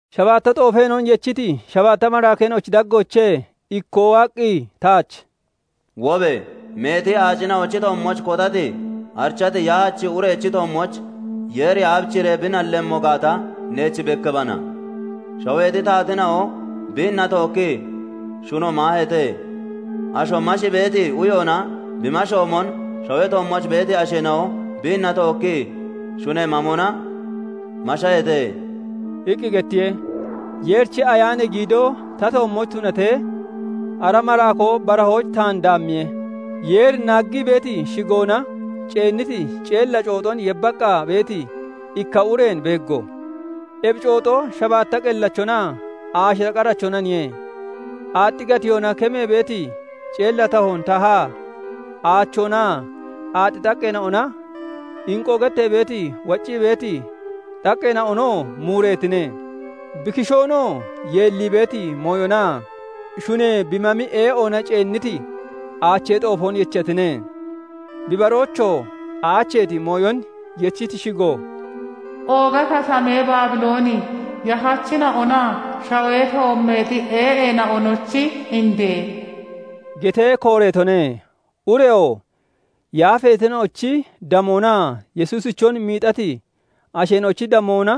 Shabaatta xoofeena'on yechiti shabaatta maraakeena'ochi daggoochee ikkoo waaqqi taach "Wobe! Meeti aacina'ochi toommooch kotati arichati yahachi urechi toommooch Yeeri aabichiree bi nallemmo gaata neech bekkiibana. Shaweexi taateena'o biinna tookkii shuno maaheete; asho mashii beeti uyoona bi mashoomon, shawee toommooch beeti asheena'o biinna tookkii shunee mam ona mashaheete" iqqi gettiye. Yeerichi Ayaanee giidoo ta toommooch tunatee, ara maraakoo barahooch taan daammiye; Yeerin naaggii beeti shigoona ceenniti ceella cooxon yebbaqqa beeti ikka ureen beeggo; ebi cooxo shabaatta qellachonaa aashira qarachonaniye. Aaxxi gatiyoona kemee beeti ceella tahoon tahaa aachoonaa aaxxi xaqqeena'ona, inqoo gettee beeti waccii beeti xaqqeena'onoo muureetine; bi kishoonoo yeellii beeti mooyonaa shunee bi mami ee'oona ceenniti aachee xoofoon yechatine. Bi baroochoo aacheeti mooyon yechiti shigo "Ooga katamee Baabilooni, yahachina'onaa shawee toommeexi ee'eena'onochi indee" getee kooreetone. Ureyoo yaafeetina'ochi damoonaa Yesuusichon miixati asheena'ochi damoona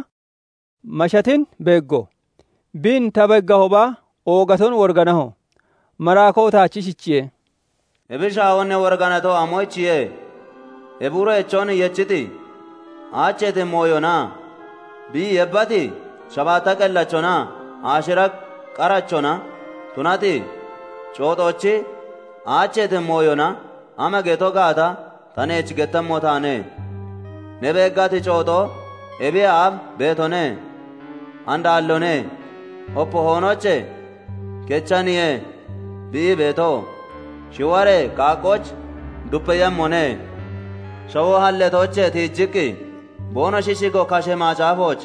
mashatin beeggo. Biin ta beeggahooba, oogaton woriganaho. Maraakoo taach ishichiye:- "Ebi shaahoon ne woriganato amoyichiye? Ebi urechon yechiti aacheeti mooyonaa bi yebbati shabaatta qellachonaa aashira qarachona tunati cooxochi aacheeti mooyona ama geto gaata ta neech gettemmo taane. Ne beeggati cooxo ebiyee aaf beetone; and aalloone; opee hoonoochee kechaniye bi ii beeto; shiwaree qaaqqooch dupeeyemmone; shawoo halleetoochee tiijiqqi boonoshi shigo kashee macaafooch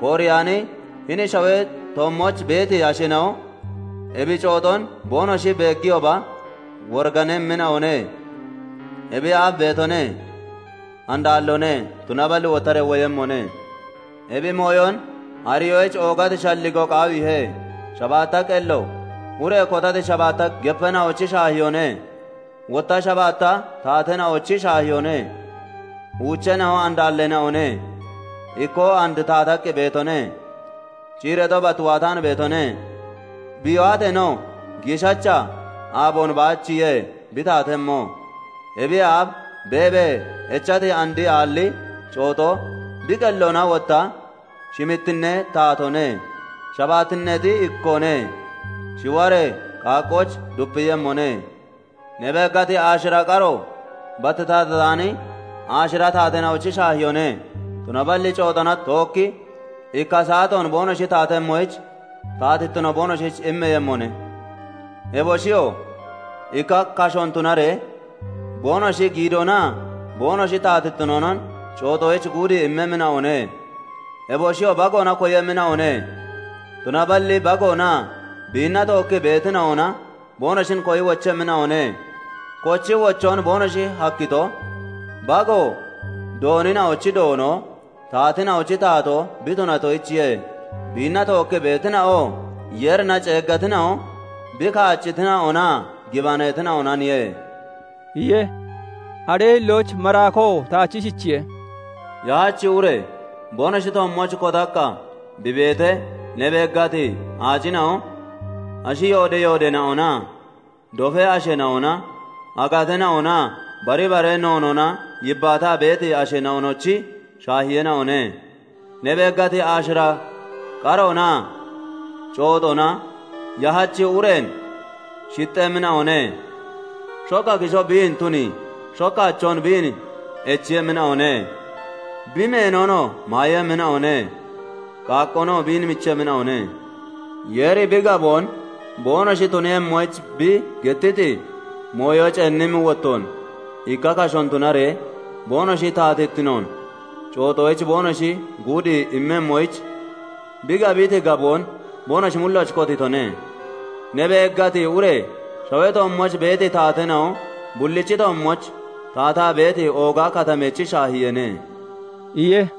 kooreyaani, hini shawee toommooch beeti asheena'o ebi cooxon boonoshi beegiyooba woriganemmina'one; ebiyee aaf beetone; and aalloone; tunaballi wottaree woyemmone. Ebi mooyon ariyoyich oogati shalligoo qaawiihe; shabaatta qello ure kotati shabaatta gepeena'ochi shaahiyoone; wotta shabaatta taateena'ochi shaahiyoone. Uucheena'o and aalleena'one; ikkoo and taataqqi beetone; ciireexo bat waataan beetone; bi waateenoo giishacha aaboon baachiye bi taatemmo. Ebiyee aaf beebee echati, and aalli cooxo bi qelloona wotta shimittinnee taatoone; shabaatteexi ikkoone; shiwaree qaaqqooch dupeeyemmone. Ne beeggati aashira qaro bat taatataani aashira taateena'ochi shaahiyoone; tunaballi cooxona tookki ikka saatoon boonoshi taatemmoyich taatittino boonoshich immeeyemmone. Eboshiyoo ikka kashoon tunaree boonoshi giidoonaa boonoshi taatittinoonon cooxoyich guudii immemmina'one. Eboshiyoo Bagoona koyemmina'one; tunaballi Bagoonaa biinna tookkii beetina'ona boonoshin koyi wochemmina'one; kochii wochoon boonoshi hakkito, Bago doonina'ochi Doono, taateena'ochi Taatoo bi tunatoyichiye; biinna tookkii beetina'oo Yeerina ceeggatina'o, bi kaaccitina'onaa gibaneetina'onaniye" iye. Aree hillooch maraakoo taach ishichiye:- "Yahachi ure boonoshi toommooch kotaqqa bi beetee ne beeggati aacina'o, ashi yoodi yoodeena'onaa dofee asheena'ona, aagateena'onaa bari bara noonoona yibbaataa beeti asheena'onochi shaahiyeena'one. Ne beeggati aashira qaroonaa cooxona yahachi ureen shixxemmina'one; shokka kishoo biin tunii, shokka achoon biin echiiyemmina'one; bi meenonoo maayemmina'one; qaaqqoonoo biin michemmina'one. Yeeri bi gaboon boonoshi tuniiyemmoyich, bi gettiti mooyo ceennimmi wottoon ikka kashoon tunaree boonoshi taatittinoon cooxoyich boonoshi guudii immemmoyich, bi gabiti gaboon boonoshi mullooch kotiitone. Ne beeggati ure shawee toommooch beeti taateena'o bullichi toommooch taataa beeti ooga katamechi shaahiyeene" iye.